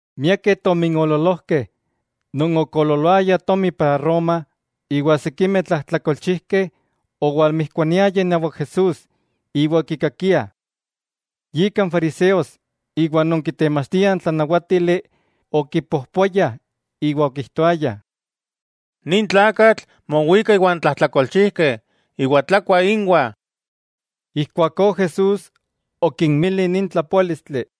Miakeh tominoololojkeh, non okoololoaya tomi para Roma, iwa sikimeh tlajtlakolchijkeh owalmijkuaniayah inawak Jesús iwa okikakiah, yika n fariseos iwa non kitemachtiah n tlanawatili okipojpoayah iwa okijtoayah: —Nin tlakatl mowika iwan tlajtlakolchijkeh iwa tlakua ínwah. Ijkuakó Jesús okinmili nin tlapoálistli: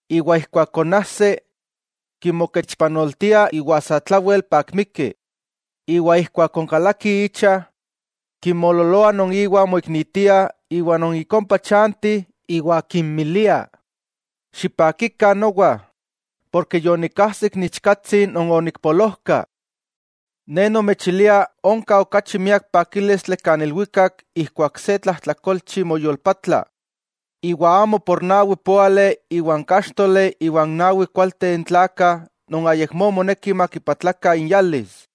Iwa ijkuak konajsi, kimokechpanoltia iwa satlawel pakmiki, iwa ijkuak onkalaki icha, kinmoololoa non iwa moiknitia, iwa non ik ompa chanti iwa kinmilia: “Xipakikah nowa, porke yonikajsik n ichkatsi non onikpolojka.” Ne nomechilia onka okachi miak pakílistli kan ilwikak ijkuak se tlajtlakolchi moyolpatla, iwa amo por nawi póali iwa n káxtoli iwa n nawi kualteh n tlakah non ayakmó moneki makipatlakah inyalis.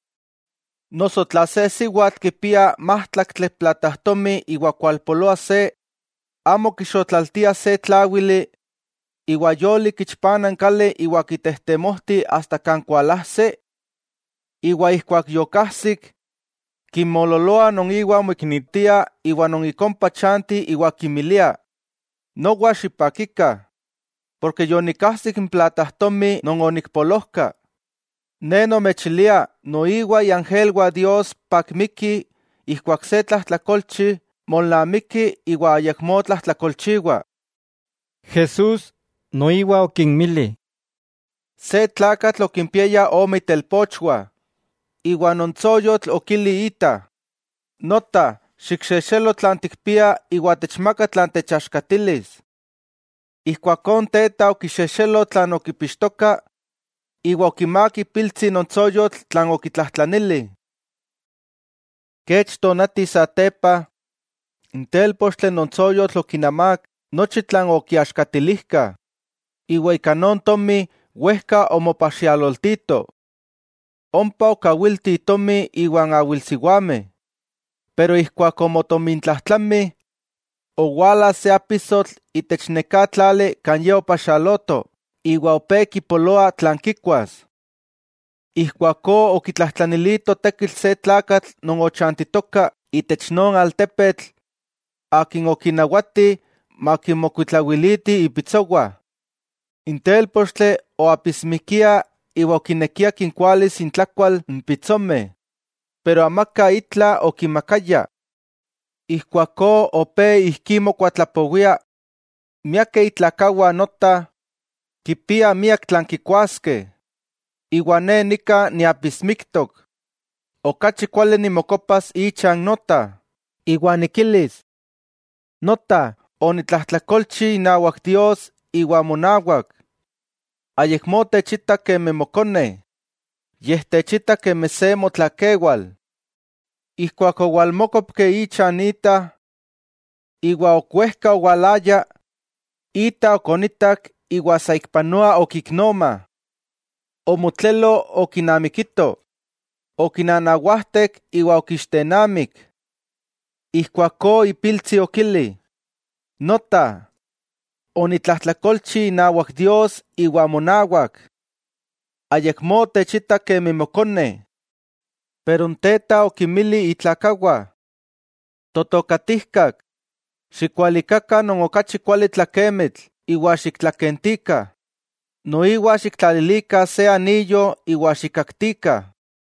'Noso tla se siwatl kipia májtlaktli platajtomi iwa kualpoloa se, ¿amo kixotlaltia se tláwili, iwa yolik kichpana n kali iwa kitejtemojti asta kan kualajsi? Iwa ijkuak yokajsik, kinmoololoa non iwa moiknitia iwa non ik ompa chanti iwa kinmilia: “Nowa xipakikah, porke yonikajsik n platajtomi non onikpolojka.” Ne nomechilia, noiwa iangelwah Dios pakmikih ijkuak se tlajtlakolchi molnamiki iwa ayakmó tlajtlakolchiwa. Jesús noiwa okinmili: —Se tlakatl okimpiaya ome itelpochwah, iwa non tsoyotl okili ita: “Nota, xikxejxelo tlan tikpia iwa techmaka tlan techaxkatilis.” Ijkuakó n teta okixejxelo tlan okipixtoka, iwa okimák ipiltsi non tsoyotl tlan okitlajtlanili. Kech tonati satepa, n télpochtli non tsoyotl okinamák nochi tlan okiaxkatilijkah, iwa ika non tomi wejka omopaxialoltito. Ompa okawilti itomi iwan awilsiwameh. Pero ijkuak omotomintlajtlami, owala se apisotl itech neká tlali kan ye opaxialoto iwa opé kipoloa tlan kikuas. Ijkuakó okitlajtlanilito tekitl se tlakatl non ochantitoka itech non altepetl, akin okinawati makinmokuitlawiliti ipitsowah. N télpochtli oapismikia iwa okinekia kinkualis intlakual n pitsomeh, pero amaka itla okimakaya. Ijkuakó opé ijkí mokuatlapowia: “¡Miakeh itlakawah nota, kipiah miak tlan kikuaskeh, iwa ne nika niapismiktok! Okachi kuali nimokopas ichan nota, iwa nikilis: nota, onitlajtlakolchi inawak Dios iwa monawak. Ayakmó techita kemi mokone; yej techita kemi se motlakewal.” Ijkuak owalmókopki icha n ita. 'Iwa ok wejka owalaya, ita okonitak iwa saikpanoa okiknoma. Omotlelo okinamikito, okinanawajtek iwa okiixtennamik. Ijkuakó ipiltsi okili: “Nota, onitlajtlakolchi inawak Dios iwa monawak. Ayakmó techita kemi mokone.” Ijkuakó n teta okinmili itlakawah: “Totokatijkak, xikualikakah non okachi kuali tlakemitl iwa xiktlakentikah; noiwa xiktlalilikah se aniyo iwa xikkaktikah.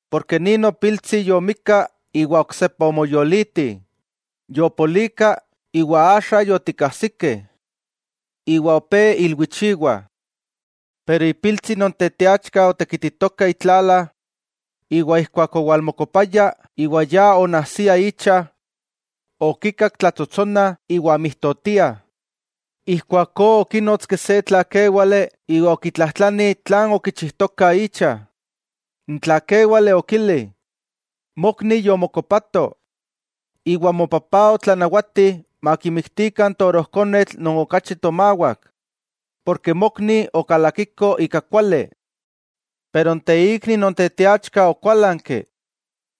Porke nin nopiltsi yomikka, iwa oksepa omoyoliti, yopolika, iwa axa yotikajsikeh.” Iwa opé ilwichiwah. 'Pero ipiltsi non teteachka otekititoka itlala; iwa ijkuak owalmokopaya iwa ya onajsia icha, okikak tlatsotsonah iwa mijtotiah. Ijkuakó okínotski se tlakéwale iwa okitlajtlani tlan okichijtokah icha. N tlakéwale okili: “Mokni yomokopato, iwa mopapá otlanawati makimiktikah n torojkonetl non okachi tomawak, porke mokni okalakiko ika kuali.” Pero n teikni non teteachka okuálanki,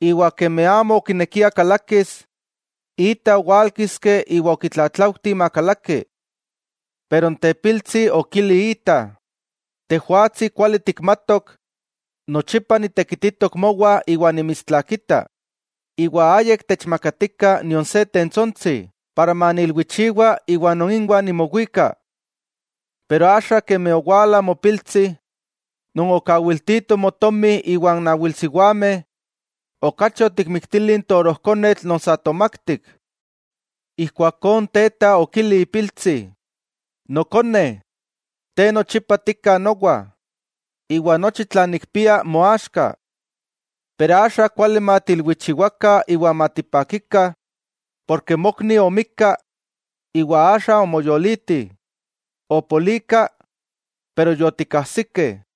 iwa kemi amo okinekia kalakis, ita owálkiski iwa okitlatlaujti makalaki. Pero n tepiltsi okili ita: “Tejwatsi kuali tikmatok nochipa nitekititok mowah iwa nimitstlakita, iwa ayik techmakatikah nion se tentsontsi, para maniilwichiwa iwa non inwa nimowika. Pero axa kemi owala mopiltsi, non okawiltito motomi iwan awilsiwameh, okachi otikmiktili n torojkonetl non sa tomaktik.” Ijkuakó n teta okili ipiltsi: “Nokone, te nochipa tika nowa, iwa nochi tlan nikpia moaxka. Pero axa kuali matiilwichiwakah iwa matipakikah, porke mokni omikka, iwa axa omoyoliti; opolika, pero yotikajsikeh.”